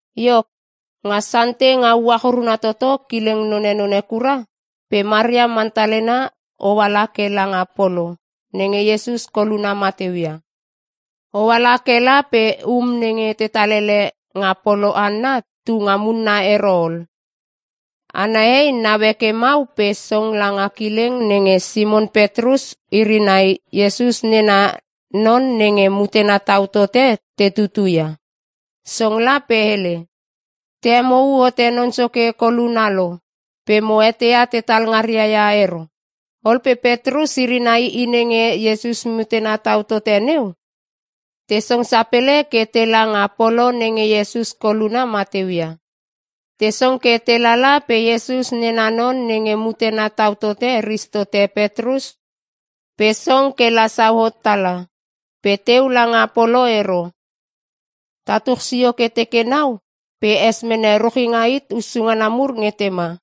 Iok, nga Sante nga uach uruna toto kileng nonenone kura pe Maria Mantalena oala ke langa polo nenge Iesus koluna mateu ia. Oala kela pe um nenge tetal ele nga polo hanna tunga munna ero ol. Ana hei naue ke mau pe song langa kileng nenge Simon Petrus iri nai Iesus nena non nenge mutena tau tote te tutu ia. Song la pe hele, “Te hemou hote Non Soke koluna lo pe mo eteia tetal ngaria ia ero.” Ol pe Petrus iri nai i nenge Iesus mutena tau tote neu, te song sapele ke tela nga polo nenge Iesus koluna mateu ia. Te song ke te lala pe Iesus nena non nenge mutena tau tote ris tote Petrus pe song kela sauhot tala, pe teu langa polo ero. Tatuch sio ke teke nau pe es mene ruchinga hit hussu ngana mur nge tema.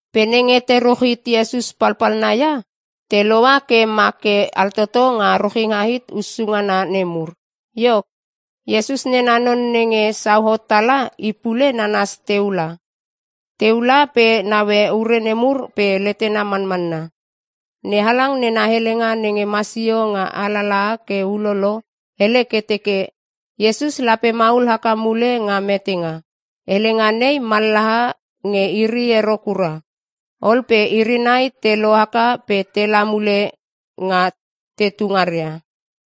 Pe nenge te ruch hit Iesus palpalna ia, te loua ke ma ke altoto nga ruchinga hit hussu ngana nemur. Iok, Iesus nena non nenge sauhot tala i pule nanas teu la. Teu la pe naue ure nemur pe letena manmanna. NeHalang nena helenga nenge masio nga alalaha ke ulolo hele ke teke, “Iesus lape maul haka mule nga metenga.” Helenga nei mallaha nge iri ero kura. Ol pe iri nai te lohaka pe tela mule nga tetu ngaria.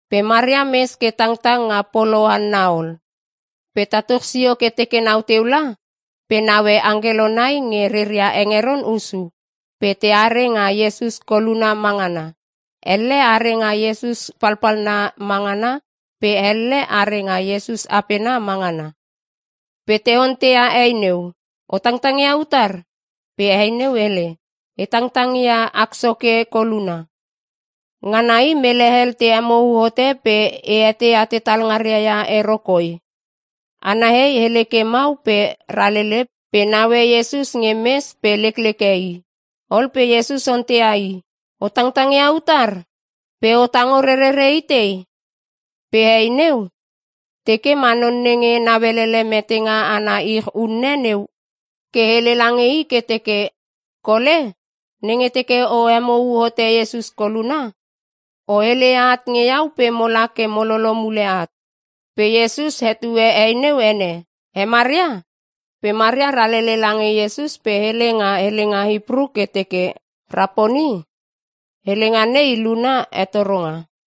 Pe Maria mes ke tangtang nga polo hanna ol. Pe tatuch sio ke teke nau teu la, pe naue angkelo nai nge reria hengeron hussu pe teare nga Iesus koluna ma ngana. Elle are nga Iesus palpalna ma ngana pe elle are nga Iesus apena ma ngana. Pe te onteia hei neu, “O tangtang ia utar?” Pe hei neu hele, “E tangtang ia ak Soke koluna, ngana i mele hel te hemou hote pe e eteia tetal ngaria ia i ero koi.” Ana hei hele ke mau pe ralele pe naue Iesus nge mes pe lekleke i. Ol pe Iesus onteia i, “O tangtang ia utar? Pe o tango rerere itei?” Pe hei neu teke ma non nenge nauelele metenga ana ich unne neu ke hele lange i ke teke, “Kole, nenge teke o hemou hote Iesus koluna, o heleia at nge iau pe mola ke mo lolo mule at.” Pe Iesus hetue hei neu ene, “He Maria!” Pe Maria ralele lange Iesus pe hele nga helenga Hipru ke teke, “Raponi!” (Helenga nei luna, “Hetoronga.”)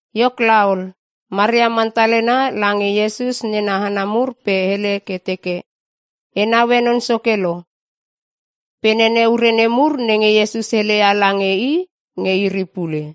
Iok laol, Maria Mantalena lange Iesus nena hana mur pe hele ke teke, “E naue Non Soke lo.” Pe nene ure nemur nenge Iesus heleia lange i nge iri pule.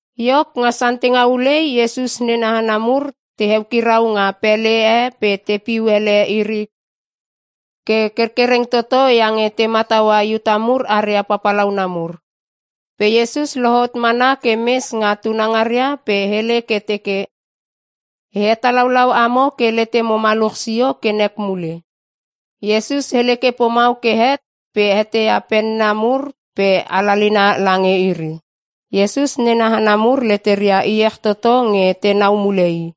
Iok, nga Sante nga ulei Iesus nena hana mur te eukirau nga pele e pe tepiu ele iri ke kerkereng toto iange te mataua Iuta mur aria papalauna mur. Pe Iesus lohot mana ke mes nga tunangaria pe hele ke teke, “E hetalaulau amo ke letemo maluch sio ke nek mule.” Iesus hele ke pomau ke het pe heteia penna mur pe alalina lange iri. Iesus nena hana mur leteria iech toto nge tenau mule i.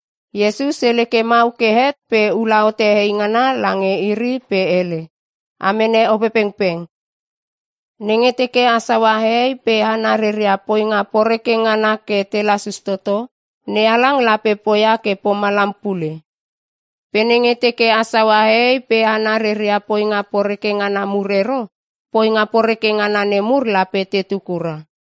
Iesus hele ke mau ke het pe ula hote eingana lange iri pe hele, “A mene Opepengpeng. Nenge teke a saua hehei pe hana reria poinga poreke ngana ke te lasus toto, NeHalang lape poia ke pomalam pule. Pe nenge teke a saua hehei pe hana reria poinga poreke ngana mur ero, poinga poreke ngana nemur lape tetu kura.”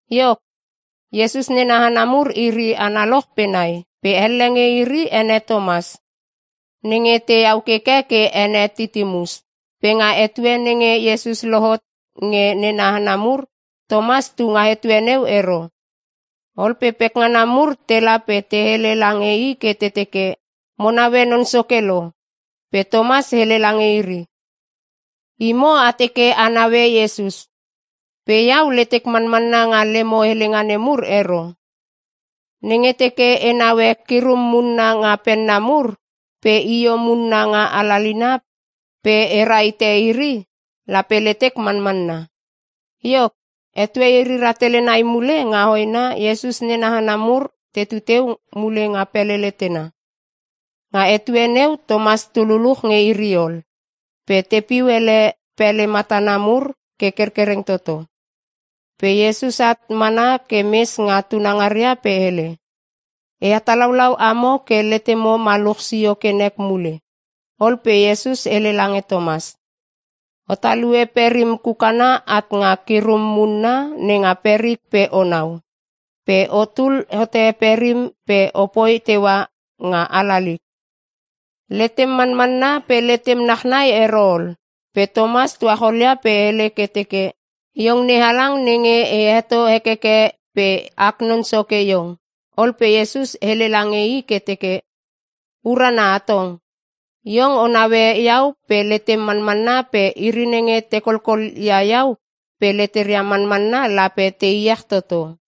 Iok, Iesus nena hana mur iri analoch pe nai pe elle nge iri ene Tomas (nenge tehau keke ke ene Titimus). Pe nga etue nenge Iesus lohot nge nena hana mur Tomas tunga etue neu ero. Ol pe pekngana mur tela pe te hele lange i ke te teke, “Mo naue Non Soke lo!” Pe Tomas hele lange iri, “Imo a teke a naue Iesus pe iau letek manmanna nga lemo helenga nemur ero. Nenge teke e naue kirum munna nga penna mur pe io munna nga alalina pe e rahite iri lape letek manmanna.” Iok, etue iri rahtele nai mule nga hoena Iesus nena hana mur tetu teu mule nga pele letena. Nga etue neu Tomas tu luluch nge iri ol. Pe tepiu ele pele matana mur ke kerkereng toto. Pe Iesus at mana ke mes nga tunangaria pe hele, “E hetalaulau amo ke letemo maluch sio ke nek mule.” Ol pe Iesus hele lange Tomas, “O talue perim kukana at nga kirum munna nenga perik pe onau. Pe otul hote perim pe opoi teua nga alalik. Letem manmanna pe letem nachnai ero ol.” Pe Tomas tucholia pe hele ke teke, “Iong NeHalang nenge e heto hekeke pe ak Non Soke iong!” Ol pe Iesus hele lange i ke teke, “Urana hatong! Iong o naue iau pe letem manmanna pe iri nenge te kolkol ia iau pe leteria manmanna lape te iech toto.”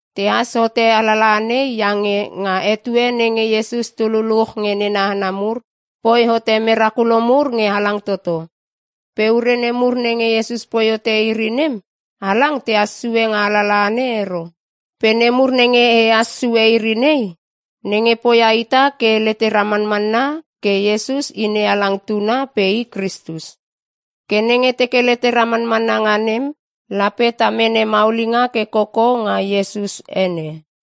Tehas hote alalaha nei iange nga etue nenge Iesus tu luluch nge nena hana mur, poi hote merakulo mur nge halang toto. Pe ure nemur nenge Iesus poi hote iri nem, halang tehas sue nga alalaha nei ero. Pe nemur nenge ehas sue iri nei, nenge poia ita ke letera manmanna ke Iesus i NeHalang Tuna pe i Kristus. Ke nenge teke letera manmanna nga nem, lape ta mene maulinga ke koko nga Iesus ene.